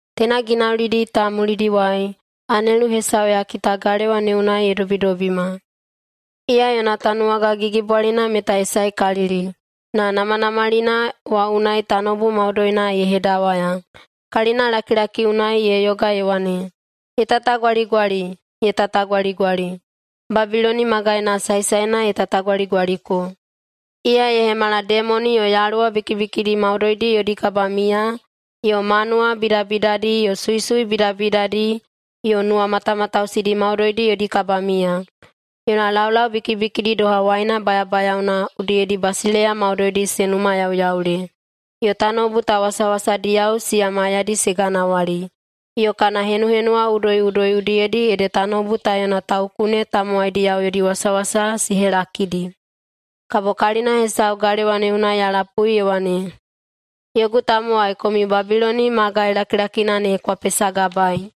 Teina ginaulidi ta mulidiwai, anelu hesau ya kita galewa ne unai ye dobidobima. Iya yona tanuwaga gigibwalina meta ye saekalili, na namanamalina wa unai tanoubu maudoina ye hedawaya. Kalinalakilaki unai ye yoga ye wane, “Ye tatagwaligwali, ye tatagwaligali! Babiloni magaina saesaena ye tatagwaligwaliko! Iya ye hemala demoni yo yaluwa bikibikidi maudoidi yodi kabamiya yo manuwa bidabidadi yo suisui bidabidadi yo nuwamatamatausidi maudoidi yodi kabamiya. Yona laulau bikibikidi doha waina bayabayaona udiyedi basileiya maudoidi se numayauyaule, yo tanoubu ta wasawasadiyao siya maiyadi se ganawali, yo kana henuhenuwa udoiꞌudoi udiyedi ede tanoubu ta yona taukune tamowaidiyao yodi wasawasa se helakidi.” Kabo kalina hesau galewa ne unai ya lapui ye wane, “Yogu tamowai, komiu Babiloni magai lakilakina ne kwa pesagabaei,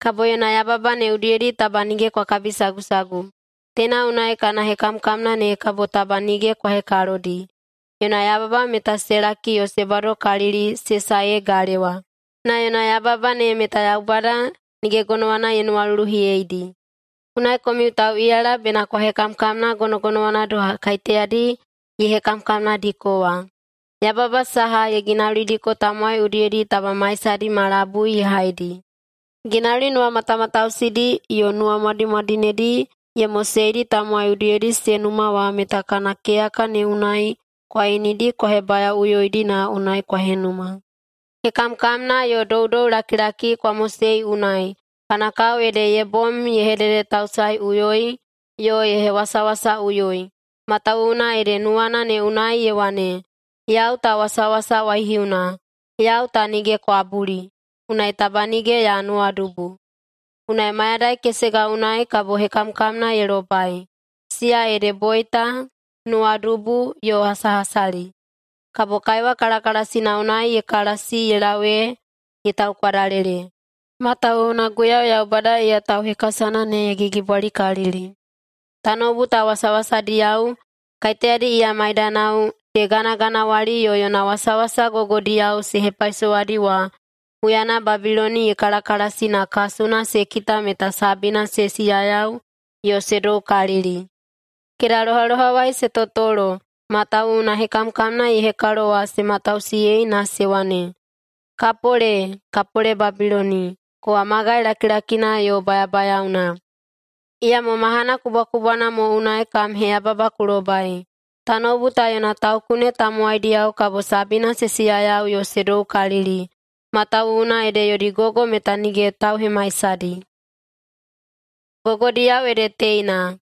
kabo yona yababa ne udiyedi taba nige kwa kabisagusagu. Teina unai kana hekamkamna ne kabo taba nige kwa hekalodi. Yona yababa meta se laki yo se badokalili se sae ee galewa, na yona yababa ne meta Yaubada nige gonowana ye nuwaluluhiyeidi. Unai komiu tauꞌiyala bena kwa hekamkamna gonogonowana doha kaiteyadi ye hekamkamnadiko wa. Yababa saha ye ginaulidiko tamowai udiyedi taba maisadi ma labui ye haidi. Ginauli nuwamatamatausidi yo nuwamwadimwadinedi ye moseidi tamowai udiyedi se numa wa meta kana keyaka ne unai kwa inidi kwa hebayaoꞌuyoidi na unai kwa henuma. Hekamkamna yo doudoulakilaki kwa mosei unai kana kao ede ye bom ye hededetausaeꞌuyoi yo ye hewasawasaꞌuyoi, matawuwuna ede nuwana ne unai ye wane, ‘Yau ta wasawasa waihiuna, yau ta nige kwabuli. Unai taba nige ya nuwadubu.’ Unai mayadai kesega unai kabo hekamkamna ye lobai, siya ede boita, nuwadubu yo hasahasali. Kabo kaiwa kalakalasina unai ye kalasi ye lau ee ye taukwadalele, matawuwuna Guiyau Yaubada iya tauhekasana ne ye gigibwalikalili.” Tanoubu ta wasawasadiyao, kaiteyadi iya maidanao se ganaganawali yo yona wasawasa gogodiyao se hepaisowadi wa, huyana Babiloni ye kalakalasi na kasuna se kita meta sabina se siyayau yo se doukalili. Kedalohalohawai se totolo, matawuwuna hekamkamna ye hekalo wa se matausiyei, na se wane, “Kapole! Kapole Babiloni, kowa magai lakilakina yo bayabayaona! Iyamo mahana kubwakubwana mo unai kam heyababa ku lobai!” Tanoubu ta yona taukune tamowaidiyao kabo sabina se siyayau yo se doukalili, matawuwuna ede yodi gogo meta nige tauhemaisahaidi. Gogodiyao ede teina: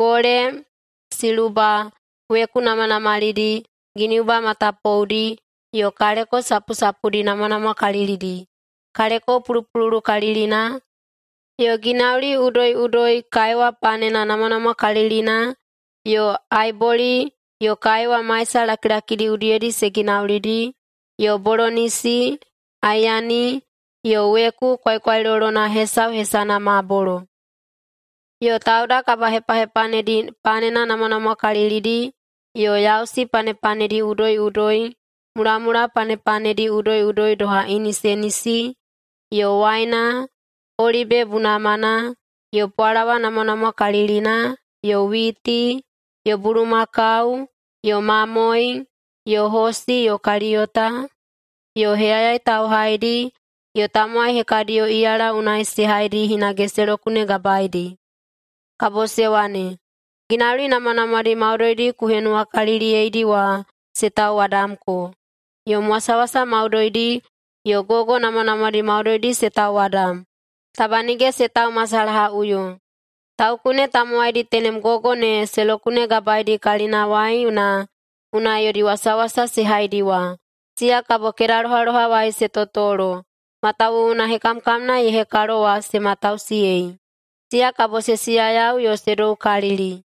Gole, siluba, weku namanamalidi, giniuba matapoudi, yo kaleko sapusapudi namwanamwakalilidi, kaleko pulupululukalilina, yo ginauli udoiꞌudoi kaiwa panena namwanamwakalilina yo aiboli yo kaiwa maisa lakilakidi udiyedi se ginaulidi, yo bolonisi, aeyani yo weku kwaikwailolona hesau hesana mabolo. Yo tauda kabahepahepanedi panena namwanamwakalilidi, yo yausi panepanedi udoiꞌudoi, mulamula panepanedi udoiꞌudoi doha inisenisi, yo waina, olibe bunamana, yo pwalawa namwanamwakalilina yo witi, yo bulumakau yo mamoe, yo hosi yo kaliyota, yo heyayai tauhaidi yo tamowai hekadiyo iyala unai se haidi hinage se lokunegabaedi. Kabo se wane, “Ginauli namwanamwadi maudoidi ku henuwakaliliyeidi wa se tauwadamko. Yom wasawasa maudoidi yo gogo namwanamwadi maudoidi se tauwadam, taba nige se taumasalahaꞌuyo.” Taukune tamowaidi tenem gogo ne se lokunegabaedi kalinawai na unai yodi wasawasa se haidi wa, siya kabo kedalohalohawai se totolo, matawuwuna hekamkamna ye hekalo wa se matausiyei. Siya kabo se siyayau yo se doukalili,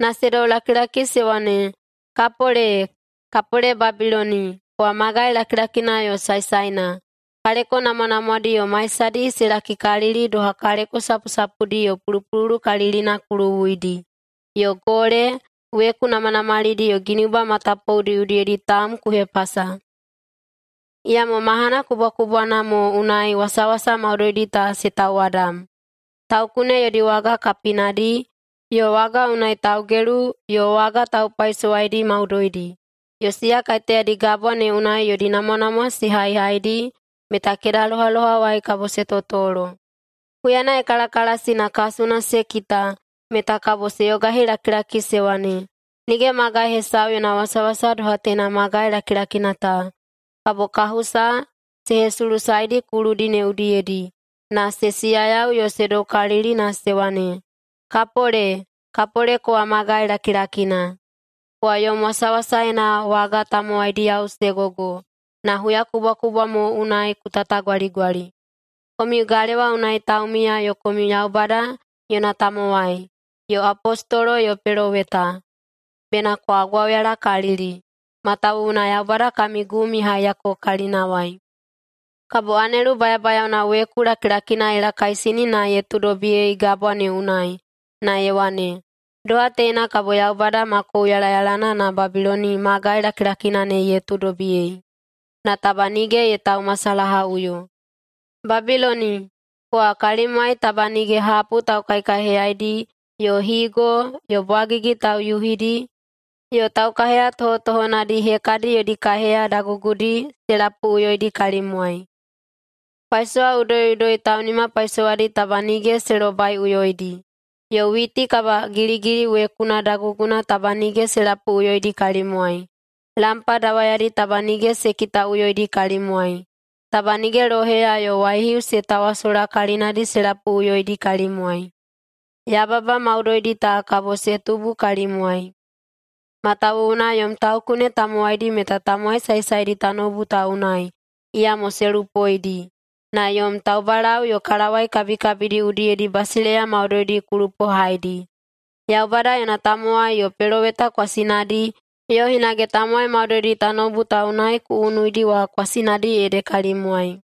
na se doulakilaki se wane, “Kapole! Kapole Babiloni, kowa magai lakilakina yo saesaena! Kaleko namwanamwadi yo maisadi se lakikalili doha kaleko sapusapudi yo pulupululukalilina ku luwuidi, yo gole, weku namanamalidi yo giniuba matapoudi udiyedi taum ku hepasa. Iyamo mahana kubwakubwana mo unai wasawasa maudoidi ta se tauwadam!” Taukune yodi waga kapinadi, yo waga unai taugelu yo waga taupaisowaidi maudoidi, yo siya kaiteyadi gabwa ne unai yodi namwanamwa se haihaidi meta kedalohalohawai kabo se totolo. Huyana ye kalakalasi na kasuna se kita, meta kabo se yogahilakilaki se wane, “Nige magai hesau yona wasawasa doha teina magai lakilakina ta!” Kabo kahusa se hesulusaedi kuludi ne udiyedi, na se siyayau yo se doukalili na se wane, “Kapole! Kapole kowa magai lakilakina. Kowa yom wasawasaena waga tanuwagadiyao se gogo! Na huyakubwakubwa mo unai ku tatagwaligwali.” Komiu galewa unai taumiya yo komiu Yaubada yona tamowai, yo apostolo yo peloweta, bena kwa gwauyalakalili! Matawuwuna Yaubada kami gum ye haiyako kalinawai. Kabo anelu bayabayaona weku lakilakina ye lakaisini na ye tuudobiyei gabwa ne unai, na ye wane, “Doha teina kabo Yaubada ma kouyalayalana na Babiloni magai lakilakina ne ye tuudobiyei, na taba nige ye taumasalahaꞌuyo. Babiloni, kowa kalimwai taba nige hapu taukaikaiheyaidi yo higo yo bwagigi tauyuhidi yo taukaiheya tohotohonadi hekadi yodi kaiheya dagugudi se lapuꞌuyoidi kalimwai. Paisowa udoiꞌudoi taunimapaisowaidi taba nige se lobaiꞌuyoidi, yo witi kabagiligili wekuna daguguna taba nige se lapuꞌuyoidi kalimwai. Lampa dawayadi taba nige se kitaꞌuyoidi kalimwai. Taba nige loheya yo waihiu se tawasola kalinadi se lapuꞌuyoidi kalimwai. Yababa maudoidi ta kabo se tubu kalimwai, matawuwuna yom taukune tamowaidi meta tamowai saesaedi tanoubu ta unai, iyamo se lupoidi, na yom taubalau yo kalawai kabikabidi udiyedi basileiya maudoidi ku lupohaidi. Yaubada yona tamowai yo peloweta kwasinadi yo hinage tamowai maudoidi tanoubu ta unai ku unuidi wa kwasinadi ede kalimwai.”